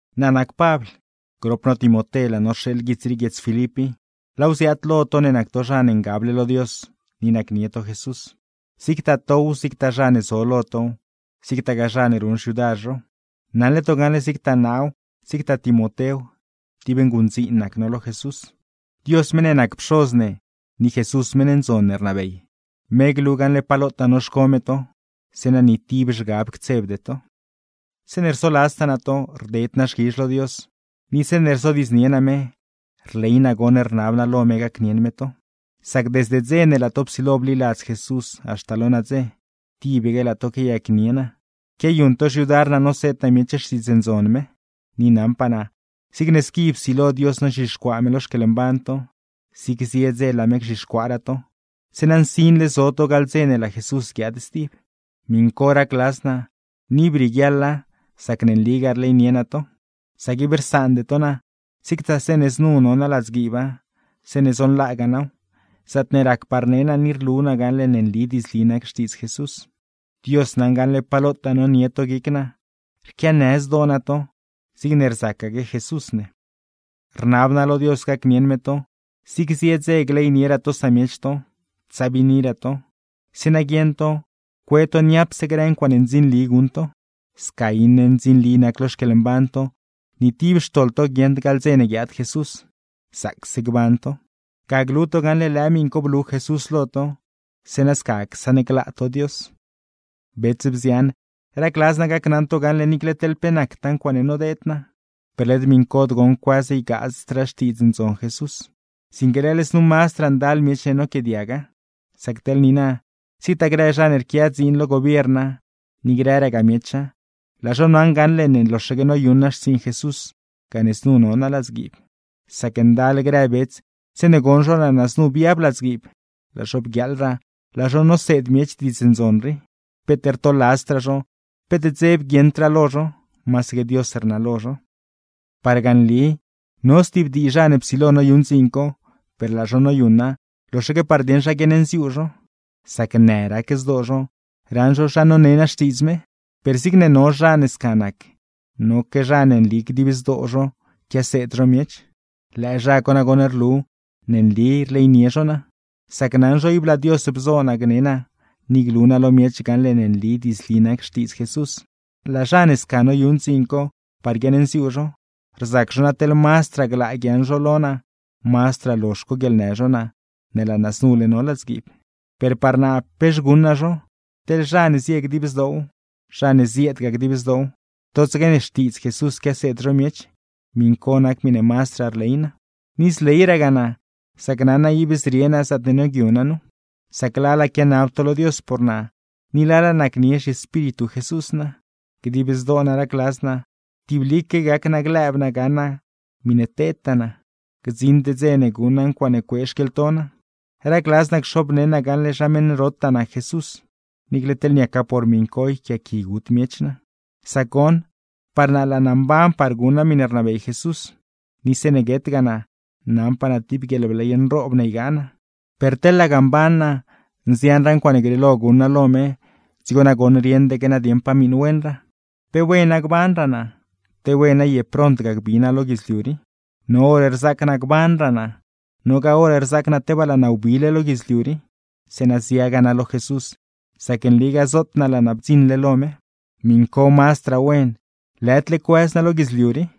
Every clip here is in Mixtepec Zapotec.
Naa nac Pabl, grop no Timoté laa no rxeeḻ guits rii guiedz Filip i. Laaw ziaad lo to ne nac to zha ne ngable lo Dios, ni nacnie to Jesús; zigtaa tow, zigtaa zha ne zo lo tow, zigtagaa zha ne ruṉ xyudar zhow. Naṉle to gaṉle zigtaa naaw, zigtaa Timotéw, tib nguṉdziin nac no lo Jesús. Dios meṉ ne nac Pxoz ne, ni Jesús meṉ ndzon ne rnabey, me glu gaṉle pa lotaa noxco me to, zeeṉa ni tib zhgab ctsebde to. Zeeṉe rsoladztaa naa to, rded naa xquizh lo Dios; ni zeeṉe rzodiidznie naa me, rley naa goṉ rnab naa lo me gacnieṉ me to; sac desde dze ne laa to psilo bliladz Jesús haxta lo nadze, tibaque laa to quiayacnie naa, quiayuṉ to xyudar naa noseed naa miech Xtiidz Ndzon me. Ni naṉpaa naa, zigne squi psilo Dios nozhixcuaa me lo xquieḻmban to, zigse zie dze laa me gzhixcuaaraa to, zeeṉa nsinle zo to gaḻ dze ne laa Jesús guiaad stib. Miṉ co racladz naa, ni ib rieguiaḻa sac ne nligaa rleynie naa to. Sac ib rsaande to naa, zigtaa zeeṉe znu no naa ladzguiiba, zeeṉe zonlaagaa naaw, zaatne racpaa rne naa ni rlu naa gaṉle ne nli diidzli nac Xtiidz Jesús. Dios naṉ gaṉle pa lotaa nonie to guic naa, rquianë zdoo naa to, zigne rzacaque Jesús ne. Rnab naa lo Dios gacnieṉ me to, zig zie dze gleynieraa to samiech to, tsabiiniraa to, zeeṉa guieṉ to cue to niapse grë ncuaaṉe ndzinli guṉ to. Sca iṉe ndzinli nac lo xquieḻmban to, ni tib xtoḻ to guieṉd gaḻ dze ne guiaad Jesús; zaacse gban to. Ga glu to gaṉle lëë miṉ co blu Jesús lo to, zeeṉa sca csaṉglaa to Dios. Bets, bzian, racladz naa gacnaṉ to gaṉle niicle teḻ pe nactaa ncuaaṉe nodeed naa, per led miṉcod goṉ cuëz ygaazdraa Xtiidz Ndzon Jesús, sinque leḻ znu mazdraa ndal miech ne noquiaadiaga. Sac teḻ niina, zigtaa grë zha ne rquia dziin lo gobierna, ni grëragaa miecha, laa zho naṉle gaṉle ne loxaque noyuṉ naa xtsiiṉ Jesús gane znu no naa ladzguiib. Sac ndal grë bets zeeṉe goṉ zho laa naa znu biab ladzguiib, laa zho bguiaaḻraa laa zho noseed miech Diidz Ndzon rii; peet rtoladzdraa zho, peet dzeb guieṉdraa lo zho, masaque Dios rnalo zho. Parga nli no stib dii zha ne psilo noyuṉ dziin co, per laa zho noyuṉa loxaque par dieṉ zha guiaṉnziuu zho, sac në rac zdoo zho raṉ zho zha none naa Xtiidz me. Per zigne no zha ne sca nac, noque zha ne nli dib zdoo zho quiaseed zho miech. Lëë zha co nagoṉ rlu ne nli rleynie zho naa; sac naṉ zho ib laa Dios bzo naa gne naa ni glu naa lo miech gaṉle ne nli diidzli nac Xtiidz Jesús; laa zha ne sca noyuṉ dziin co par guiaṉnziuu zho, rzac zho na teḻ mazdraa glaa guiaaṉ zho lo naa, mazdraa lozh coguieḻnë zho naa ne laa naa znule no ladzguiib. Per par naa, pex guṉ naa zho. Teḻ zha ne zie dib zdoow, zha ne zieedgaa dib zdoow, totsaque ne Xtiidz Jesús quiaseed zho miech; miṉ co nac miṉe mazdraa rley naa. Ni zleyragaa naa, sac naṉ naa ib zrie naa zaatne nioogyu naa nu; sac lala quianab to lo Dios por naa, ni lala nacnie zhiEspíritu Jesús naa. Dib zdoo naa racladz naa, tiblique gac naa lëëb naa gaṉ naa miṉe tedtaa naa, gdziṉd dze ne guṉ naa ncuaaṉe cuee xquieḻto naa. Racladz naa cxobneṉ naa gaṉle zha meṉ rotaa nac Jesús; niicle teḻ niaca por miṉ co yquiaaqui gut miech naa. Sac goṉ, par naa laa naa mban par guṉ naa miṉe rnabey Jesús, ni zeeṉe guetgaa naa, naṉpaa naa tib guieḻbley nroob ne ygaa naa. Per teḻ laga mban naa, nzianraa ncuaaṉe grieelo guṉ naa lo me; dzigo nagoṉ rieṉdaque naa dieṉ pa miṉ wenraa. ¡Pe wena gbanraa naa, te wena ye prontga gbi naa lo guidzliu rii! No hor rzaac naa gbanraa naa, nogaa hor rzaac naa tebaa laa naa wbile lo guidzliu rii; zeeṉa ziagaa naa lo Jesús, sac nligaa zoot naa laa naa bdziṉle lo me. ¡Miṉ co mazdraa wen, lëdle cuëz naa lo guidzliu rii!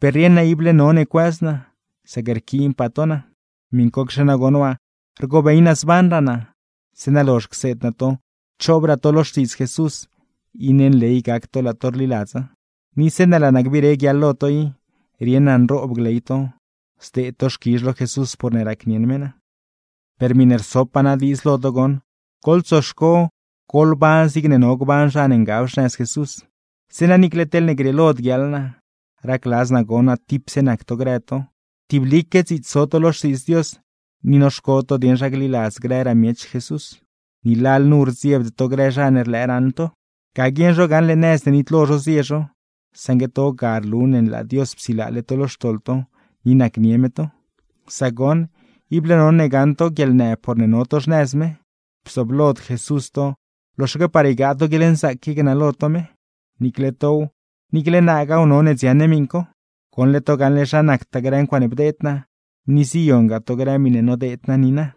Per rieṉ naa ible none cuëz naa, sac rquiinpaa to naa. Miṉcocxe nagoṉ waa, rgobey naa zbanraa naa, zeeṉa lozh cseed naa to choobraa to lo Xtiidz Jesús, iṉe nley gac to laa to rliladza; ni zeeṉe laa naa gbire guiaḻ lo to i, rieṉ naa nroob gley to, zdeed to xquizh lo Jesús porne racnieṉ me naa. Per miṉe rsopaa naa diidz lo to goṉ: Goḻtsoxco goḻban zigne no gban zha ne ngab xnëz Jesús, zeeṉa niicle teḻne grieelod guiaḻ naa, racladz naa gon naa tipse nac to grë to, tiblique dziits zo to lo Xtiidz Dios; ni noxco to dieṉ zha gliladz grëraa miech Jesús, ni lalnu rdziebde to grë zha ne rlëë raṉ to. Ga guieṉ zho gaṉle nëz ne nitlo zho zie zho, saṉgue to ga rlu ne laa Dios psilaale to lo xtoḻ to, ni nacnie me to. Sac goṉ, ible none gaṉ to guieḻnë porne no to xnëz me, bzooblod Jesús to loxaque par ygaa to guieḻnzaac qui gnalo to me. Niicle tow, niicle naagaaw none dziaṉ ne miṉ co. Goṉle to gaṉle zha nactaa grë ncuaaṉe bdeed naa, ni ziyongaa to grë miṉe nodeed naa niina.